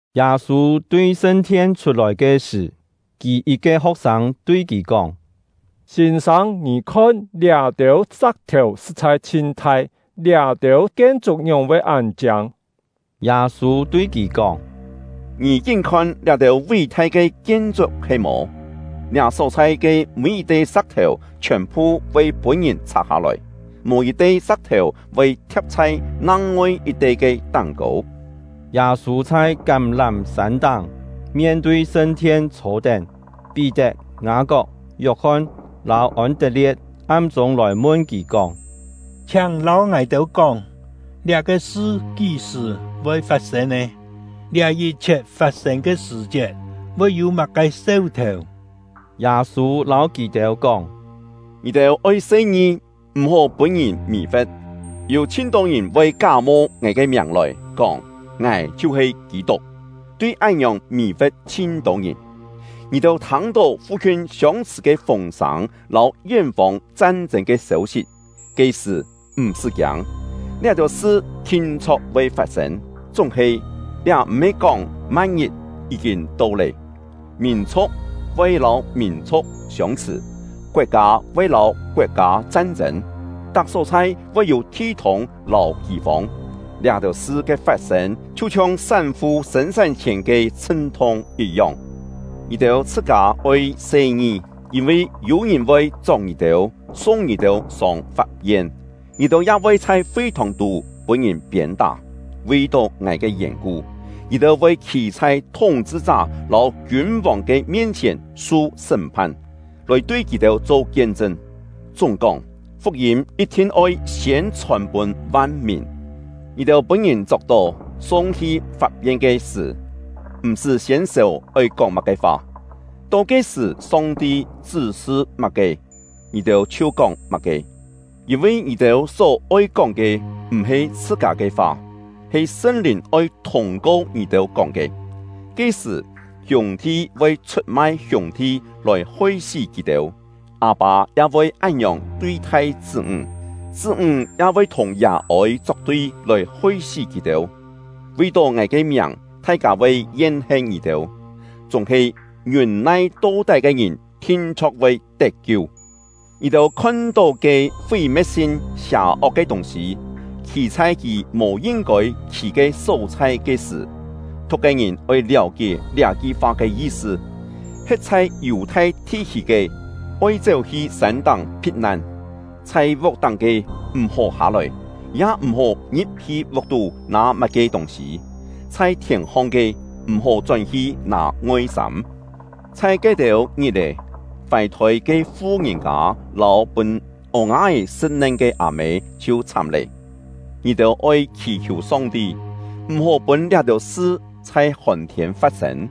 Yâ-sû tui sṳn-thien chhut-lòi ke sṳ̀, kì yit-ke ho̍k-sâng tui kì kóng: “Sîn-sâng, ngì khon, liá-têu sa̍k-thèu sṳ̍t-chhai chhin thai, liá-têu kien-chuk ngióng-voi án chiâng!” Yâ-sû tui kì kóng: “Ngì kín-khon liá-têu ví-thai ke kien-chuk he-mò? Liá só-chhai ke mî yit-te sa̍k-thèu chhiòn-phu voi pûn-ngìn chhak-hâ-lòi, mò yit-te sa̍k-thèu voi thia̍p chhai nang-ngoi yit-te ke táng-kô.” Yâ-sû chhai Kám-lám-sân táng, mien-tui sṳn-thien chhô-tén. Pí-tet, Ngâ-kok, Yok-hon lâu Ôn-tet-lie̍t am-chûng lòi mun kì kóng: “Chhiáng lâu ngài-têu kóng, liá-ke sṳ kí-sṳ̀ voi fat-sên nè? Liá yit-chhiet fat-sên ke sṳ̀-chiet voi yû má-ke seu-thèu?” Yâ-sû lâu kì-têu kóng: “Ngì-têu oi se-ngi, m̀-hó pûn-ngìn mì-fe̍t. Yû chhin-tô ngìn voi ká-mo ngài ke miàng lòi, kóng: ‘Ngài chhiu-he Kî-tuk!’ tui án-ngiòng mì-fe̍t chhin-tô ngìn. Ngì-têu thâng-tó fu-khiun siông-chhṳ̀ ke fûng-sâng lâu yén-fông chan-chên ke sêu-sit, ke-sṳ̀, m̀-sṳ́ kiâng. Liá-têu sṳ thin-chho̍k voi fat-sên; chúng-he liá m̀-he kóng ma̍t-ngit yí-kîn to lé. Mìn-chhu̍k voi lâu mìn-chhu̍k siông-chhṳ̀; koet-kâ voi lâu koet-kâ chan-chên; tak só-chhai voi yû thi-thûng lâu kî-fông. Liá-têu sṳ ke fat-sên chhiu-chhiong sán-fu sên-sán-chhièn ke chhṳn-thung yit-yong. “Ngì-têu chhṳ-kâ oi se-ngi, yîn-vi yû-ngìn voi chok ngì-têu, sung ngì-têu sông fap-yen; ngì-têu ya voi chhai fi-thòng-tú pûn-ngìn piên-tá. Vi-tó ngài ke yèn-ku, ngì-têu voi khî chhai thúng-chhṳ-chá lâu kiûn-vòng ke mien-chhièn su sṳ́m-phan, lòi tui kì-têu cho kien-chṳn. Chúng-kóng, fuk-yîm yit-thin oi siên chhòn-pûn van-mìn. Ngì-têu pûn-ngìn chok-tó, sung-hi fap-yen ke sṳ̀, m̀-sṳ́ siên sèu oi kóng má-ke fa; to ke-sṳ̀ Song-ti chṳ́-sṳ má-ke, ngì-têu chhiu kóng má-ke; yîn-vi ngì-têu só-oi kóng ke, m̀-he chhṳ-kâ ke fa, he Sṳn-Lìn oi thûng-ko ngì-têu kóng ke. Ke-sṳ̀, hiûng-thi voi chhut-mai hiûng-thi lòi hoi-sí kì-têu; â-pâ ya voi án-ngiòng tui-thai chṳ́-ńg; chṳ́-ńg ya voi thùng yà-ôi chok-tui lòi hoi-sí kì-têu. Vi-tó ngài ke miàng, thai-kâ voi yen-hen ngì-têu; chúng-he ngiûn-nai to-tái ke ngìn thin-chho̍k voi tet-kiu. “Ngì-têu khon-tó ke ‘Fí-me̍t-sin, sià-ok ke tûng-sî’ khî chhai kì mò yin-kôi khî ke só-chhai ke sṳ̀ (thu̍k ke ngìn oi liáu-kié liá-ki fa ke yi-sṳ), he̍t chhai Yù-thai thi-khî ke, oi chéu-hi sân-táng phit-nan; chhai vuk-táng ke, m̀-hó hâ-lòi, ya m̀-hó ngi̍p-hi vuk-tú nâ má-ke tûng-sî; chhai thièn-hong ke, m̀-hó chón-hi nâ ngoi-sâm. Chhai ke-têu ngit-è, fài-thôi ke fu-ngìn-kâ lâu pûn ô-nga-é sṳ̍t-nen ke â-mê chhiu chhám lé! Ngì-têu oi khì-khiù Song-ti, m̀-hó pûn liá-têu sṳ chhai hòn-thiên fat-sên!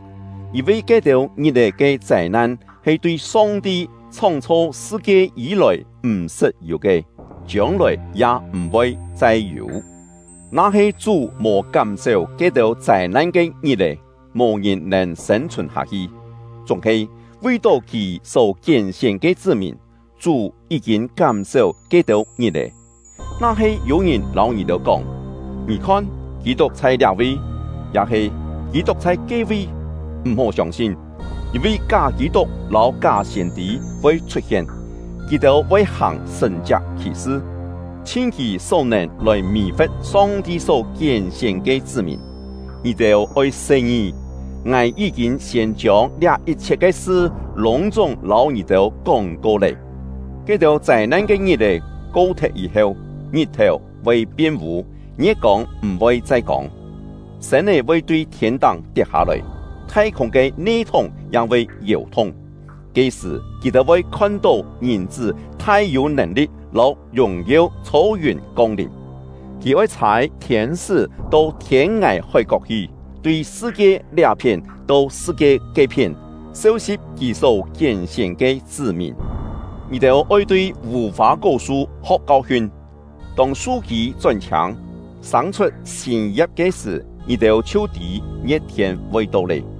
Yîn-vi ke-têu ngit-è ke châi-nan he tui Song-ti chhóng-chho sṳ-kie yî-lòi m̀-sṳt yû ke, chiông-lòi ya m̀-voi chai yû. Na-he Chú mò kám-séu ke-têu châi-nan ke ngit-è, mò ngìn nèn sên-chhùn hâ-hi. Chúng-he, vi-tó Kì só kién-sién ke chṳ́-mìn, Chú yí-kîn kám-séu ke-têu ngit-è. “Na-he yû-ngìn lâu ngì-têu kóng: ‘Ngì khon, Kî-tuk chhai liá-vi!’ ya-he ‘Kî-tuk chhai ke-vi!’ m̀-hó siông-sin. Yîn-vi ká Kî-tuk lâu ká siên-tî voi chhut-hien; kì-têu voi hàng sṳ̀n-chiak khì-sṳ, chhin kì só-nèn lòi mì-fe̍t Song-ti só kién-sién ke chṳ́-mìn. Ngì-têu oi se-ngi! Ngài yí-kîn siên chiông liá yit-chhiet ke sṳ lûng-chúng lâu ngì-têu kóng-ko lé. “Ke-têu châi-nan ke ngit-è ko-thet yî-heu, ngit-thèu voi pien vû, ngie̍t-kông m̀-voi chai kông, sên-é voi tui thiên-táng tiet-hâ-lòi, thai-khûng ke ne-thúng ya voi yèu-thung. Ke-sṳ̀, kì-têu voi khon-tó Ngìn-chṳ́ thai-yû nèn-li̍t lâu yùng-yeu chhô yùn kong-lìm. Kì oi chhâi thiên-sṳ́ to thiên-ngài hói-kok hi, tui sṳ-kie liá-phién to sṳ-kie ke-phién, seu-si̍p kì só kién-sién ke chṳ́-mìn. “Ngì-têu oi tui vù-fâ-kó-su ho̍k kau-hiun. Tông su-kî chón-chhiâng, sâng-chhut sîn ya̍p ke sṳ̀, ngì-têu chhiu tî ngie̍t-thiên voi to lé.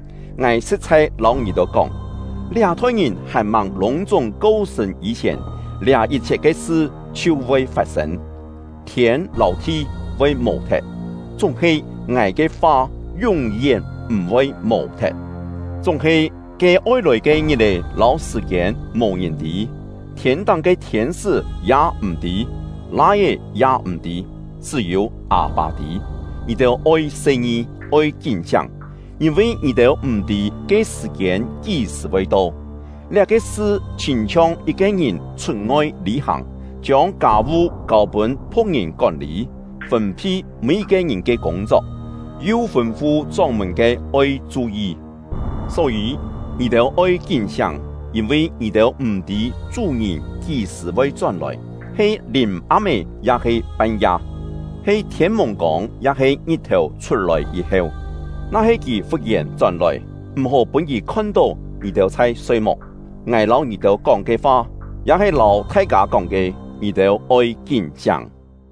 Ngài sṳ̍t-chhai lâu ngì-têu kóng, liá-thoi ngìn hàn-màng lûng-chúng ko-sṳ̂n yî-chhièn, liá yit-chhiet ke sṳ chhiu voi fat-sên. Thiên lâu thi voi mò-thet, chúng-he ngài ke fa yún-yén m̀-voi mò-thet. “Chúng-he ke oi lòi ke ngit-è lâu sṳ̀-kiên, mò ngìn tî; thiên-táng ke thiên-sṳ́ ya m̀-tî, Lai-é ya m̀-tî, chṳ́-yû Â-pâ tî. Ngì-têu oi se-ngi, oi kín-siáng, yîn-vi ngì-têu m̀-tî ke sṳ̀-kiên kí-sṳ̀ voi to. Liá-ke sṳ chhîn-chhiong yit-ke ngìn chhut-ngoi lî-hàng, chiông kâ-vu kâu-pûn phu̍k-ngìn kón-lî, fûn-phi mî-yit-ke ngìn ke kûng-chok, yu fûn-fu chóng-mùn-ke oi chu-yi. Só-yî, ngì-têu oi kín-siáng, yîn-vi ngì-têu m̀-tî chú-ngìn kí-sṳ̀ voi chón-lòi, he lìm-am-é ya-he pan-ya, he thiên-mùng-kông ya-he ngit-thèu chhut-lòi yî-heu. Na-he kì fut-yèn chón-lòi, m̀-hó pûn kì khon-tó ngì-têu chhai soi-muk! Ngài lâu ngì-têu kóng ke fa, ya he lâu thai-kâ kóng ke: Ngì-têu oi kín-siáng!”